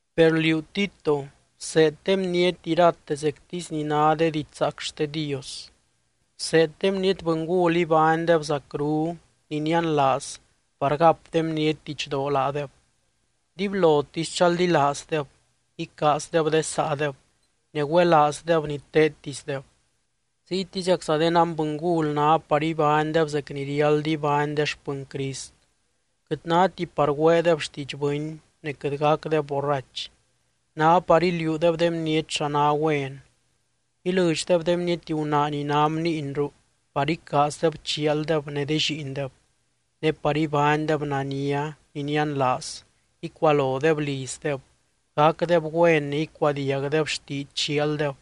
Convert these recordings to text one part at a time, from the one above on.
Per liú, Tito, bseed de bniety irate zectisy ni ná de diidx zaac xte Dios. Bseed de bniety bɨngul ibánydeb zacru, ni nianlaaz par gap de bniety didxdoo laadeb. Dibylotisy chaldilaazdeb, icaazdeb de saadeb, ne güelaazdeb ni teedtisdeb. Ziytiziacza de nanbɨngul ná par ibánydeb zec ni riáld ibány de xpɨny Crist. Quɨt náti par güeedeb xtiidx bɨny, ne quɨt gacdeb borrach. Ná par iliuudeb de bniety xa ná güen, ilɨdxdeb de bniety gunaa ni ná bniinru par icaazdeb chialdeb ne de lliindeb, ne par ibánydeb nania, ni nianlaaz, icualodeb lizdeb, gacdeb güen ne icuadiagdeb xtiidx chialdeb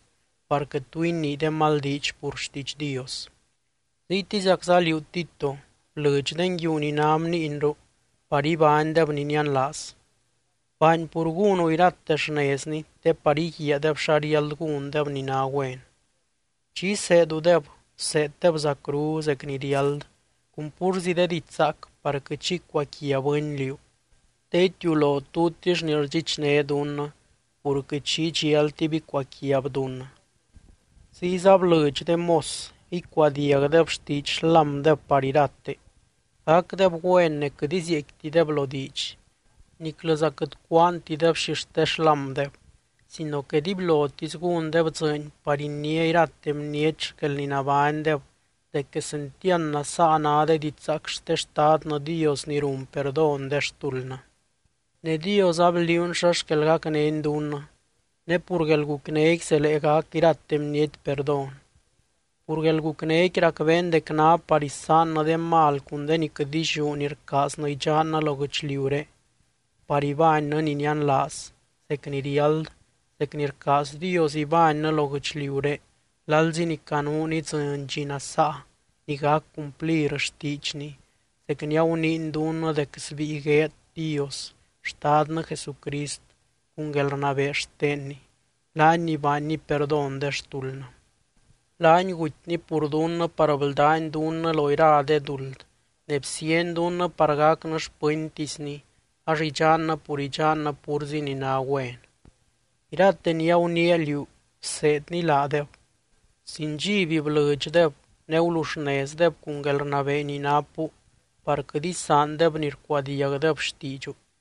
par quɨt tu inii de mal diidx pur xtiidx Dios. Ziytiziacza liú, Tito, blɨdx de nguiu ni ná bniinru par ibánydeb ni nianlaaz. Baany pur gúnu irate xnezni te par íguiaadeb xa riáld gúndeb ni ná güen. Chi iseedudeb, bseeddeb zacru, zec ni riáld, cun púrzi de diidx zaac par quɨt xi icuaquia bɨny liú, te itiulo tutix ni rdxichné dunnɨ, pur quɨt xi idxialtib icuaquiab dunnɨ. Ziyza blɨdx de mos icuadiagdeb xtiidx xlámdeb par irate, gacdeb güen ne quɨt izieecquitideb lo diidx. Niclɨza quɨt cúaantideb xixte xlámdeb, sino que dibylotisy gúndeb dzɨɨny par iniá irate bniety xquel ni nabánydeb dec quesentiand nasaa ná de didxzaac xte Xtadnɨ Dios ni run perdón de xtuldnɨ. Ne Dios abliuuny xa xquel gacnény dunnɨ, ne pur guelgucnéqui zelee gac irate bniety perdón. Pur guelgucnéqui racbeen dec ná par isaannɨ de mal cun de ni quɨt illiú ni rcaaznɨ idxannɨ lo guɨchliuré, par ibánnɨ ni nianlaaz, zec ni riáld, zec ni rcaaz Dios ibánnɨ lo guɨchliuré lalzi ni canuun idzɨny dxi nasaa ni gac cumplir xtiidxny zec ni aguniiny dunnɨ dec sbíi gueed Dios Xtadnɨ Jesucrist cun guelrnabee xtenny, laany ni baanny perdón de xtuldnɨ. Laany gutyny pur dunnɨ par bldány dunnɨ lo ira de duld ne bsiany dunnɨ par gacnɨ xpɨntisny ax idxannɨ pur idxannɨ púrzi ni ná güen. Irate ni aguniia liú bseedni laadeb. Sin dxiby blɨdxdeb, ne guluxnezdeb cun guelrnabee ni napu par quɨt isaandeb ni rcuadiagdeb xtiidxu.